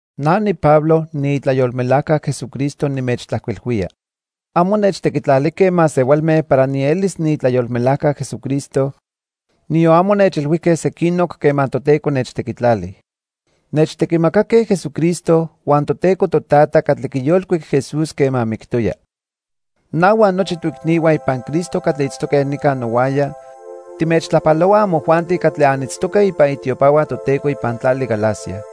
Na niPablo, niitlayolmelajca Jesucristo nimechtlajcuilhuía. Amo nechtequitlalijque masehualme para nielis niitlayolmelajca Jesucristo, niyon amo nechilhuijque sequinoc quema Toteco nechtequitlali. Nechtequimacaque Jesucristo huan Toteco Totata catli quiyolcuic Jesús quema mictoya. Na huan nochi toicnihua ipan Cristo catli itztoque nica nohuaya timechtlajpalohuaj amojuanti catli anitztoque ipan itiopahua Toteco ipan tlali Galacia.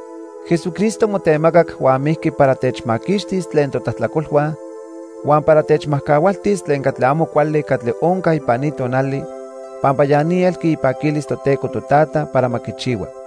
Jesucristo motemacac huan mijqui para techmaquixtis tlen totlajtlacolhua huan para techmajcahualtis tlen catli amo cuali catli onca ipan ni tonali pampa ya ni elqui ipaquilis Toteco Totata para ma quichihua.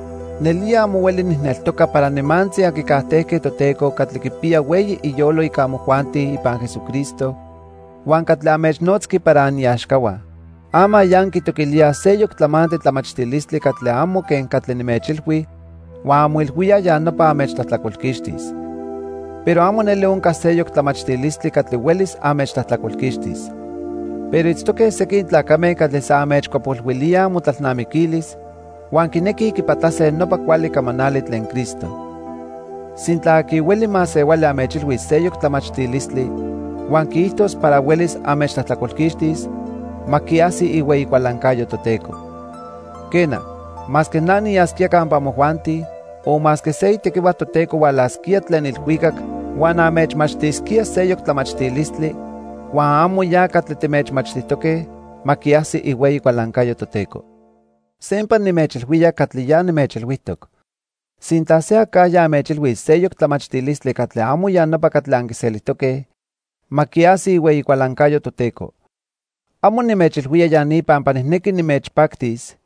Nelía amo hueli nijneltoca para nimantzi anquicajtejque Toteco catli quipiya hueyi iyolo ica amojuanti ipan Jesucristo huan catli anmechnotzqui para aniaxcahua. Ama ya anquitoquilíaj seyoc tlamantli tlamachtilistli catli amo quen catli nimechilhui huan anmoilhuíaj ya nopa anmechtlajtlacolquixtis. Pero amo neli onca seyoc tlamachtilistli catli huelis anmechtlajtlacolquixtis. Pero itztoque sequin tlacame catli san anmechcuapolhuilíaj amotlalnamiquilis, huan quinequij quipatlase nopa cuali camanali tlen Cristo. Sintla aqui hueli masehuali anmechilhuis seyoc tlamachtilistli huan quiijtos para huelis anmechtlajtlacolquixtis, ma quiajsi ihueyi cualancayo Toteco. Quena, masque na niyasquía campa amojuanti o masque se itequihua Toteco hualasquía tlen ilhuicac huan anmechmachtisquía seyoc tlamachtilistli huan amo ya catli timechmachtijtoque, ma quiajsi ihueyi cualancayo Toteco. Sempa nimechilhuía catli ya nimechilhuijtoc. Sintla se acajya anmechilhuis seyoc tlamachtilistli catli amo ya nopa catli anquiselijtoque, ma quiajsi ihueyi cualancayo Toteco. Amo nimechilhuía ya ni pampa nijnequi nimechpactis,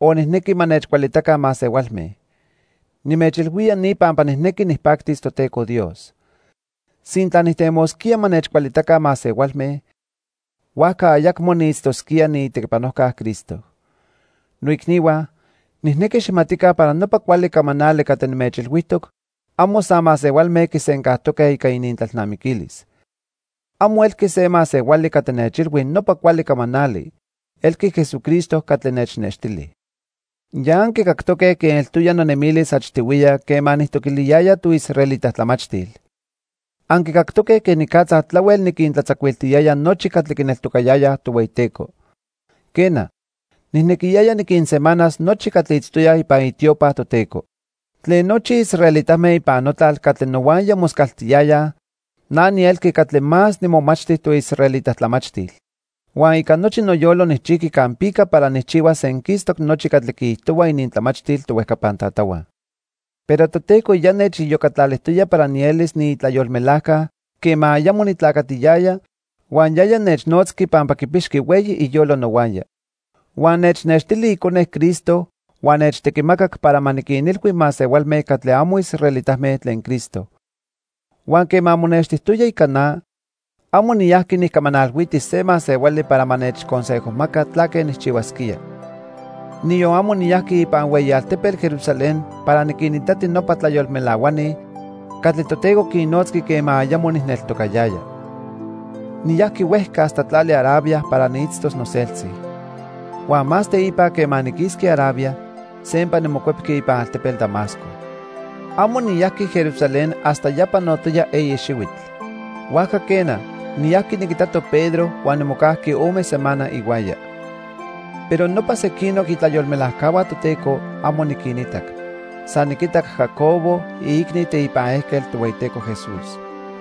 o nijnequi ma nechcualitaca masehualme. Nimechilhuía ni pampa nijnequi nijpactis Toteco Dios. Sintla nijtemosquía ma nechcualitaca masehualme, huajca ayacmo niitztosquía niitequipanojca Cristo. Noicnihua, nijnequi xijmatica para nopa cuali camanali catli nimechilhuijtoc amo san masehualme quisencajtoque ica inintlalnamiquilis. Amo elqui se masehuali catli nechilhui nopa cuali camanali, elqui Jesucristo catli nechnextili. Ya anquicactoque quen eltoya nonemilis achtihuiya quema nijtoquiliyaya toisraelita tlamachtil. Anquicactoque quenicatza tlahuel niquintlatzacuiltiyaya nochi catli quineltocayayaj Tohueyiteco. Quena, nijnequiyaya niquinsemanas nochi catli itztoyaj ipan itiopa Toteco. Tlen nochi israelitame ipan notlal catli nohuaya moscaltiyayaj na nielqui catli más nimomachti toisraelita tlamachtil. Huan ica nochi noyolo nijchijqui campica para nijchihuas senquistoc nochi catli quiijtohua inintlamachtil tohuejcapan tatahua. Pero Toteco ya nechiyocatlalijtoya para nielis niitlayolmelajca quema ayamo nitlacatiyaya, huan yaya nechnotzqui pampa quipixqui hueyi iyolo nohuaya. Huan nechnextili Icone Cristo huan nechtequimacac para ma niquinilhui masehualme catli amo israelitame tlen Cristo. Huan quema monextijtoya ica na, amo niyajqui nijcamanalhuiti se masehuali para ma nechconsejomaca tlaque nijchihuasquía. Niyon amo niyajqui ipan hueyi altepetl Jerusalén para niquinitati nopa tlayolmelahuani catli Toteco quinnotzqui quema ayamo nijneltocayaya. Niyajqui huejca hasta tlali Arabia para niitztos noseltzi. Huan más teipa quema niquisqui Arabia, sempa nimocuepqui ipan altepetl Damasco. Amo niyajqui Jerusalén hasta ya panotoya eyi xihuitl. Huajca quena, niyajqui niquitato Pedro huan nimocajqui ome semana ihuaya. Pero nopa sequinoc itlayolmelajcahua Toteco, amo niquinitac. San niquitac Jacobo, iicni teipan ejquetl Tohueyiteco Jesús.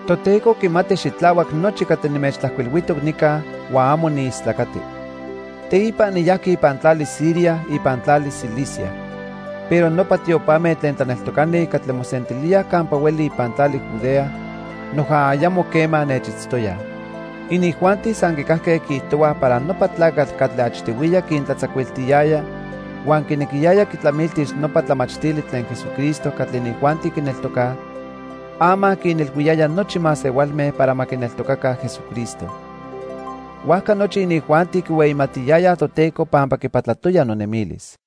Toteco quimati xitlahuac nochi catli nimechtlajcuilhuijtoc nica huan amo niistlacati. Teipa niyajqui ipan tlali Siria huan tlali Cilicia. Pero nopa tiopame tlen tlaneltocani catli mosentilíaj campa hueli ipan tlali Judea noja ayamo quema nechitztoyaj. Inijuanti san quicajque quiijtohuaj para nopa tlacatl catli achtihuiya quintlatzacuiltiyaya huan quinequiyaya quitlamiltis nopa tlamachtili tlen Jesucristo catli inijuanti quineltocaj, ama quinilhuiyaya nochi masehualme para ma quineltocaca Jesucristo. Huajca nochi inijuanti quihueyimatiyayaj Toteco pampa quipatlatoya nonemilis.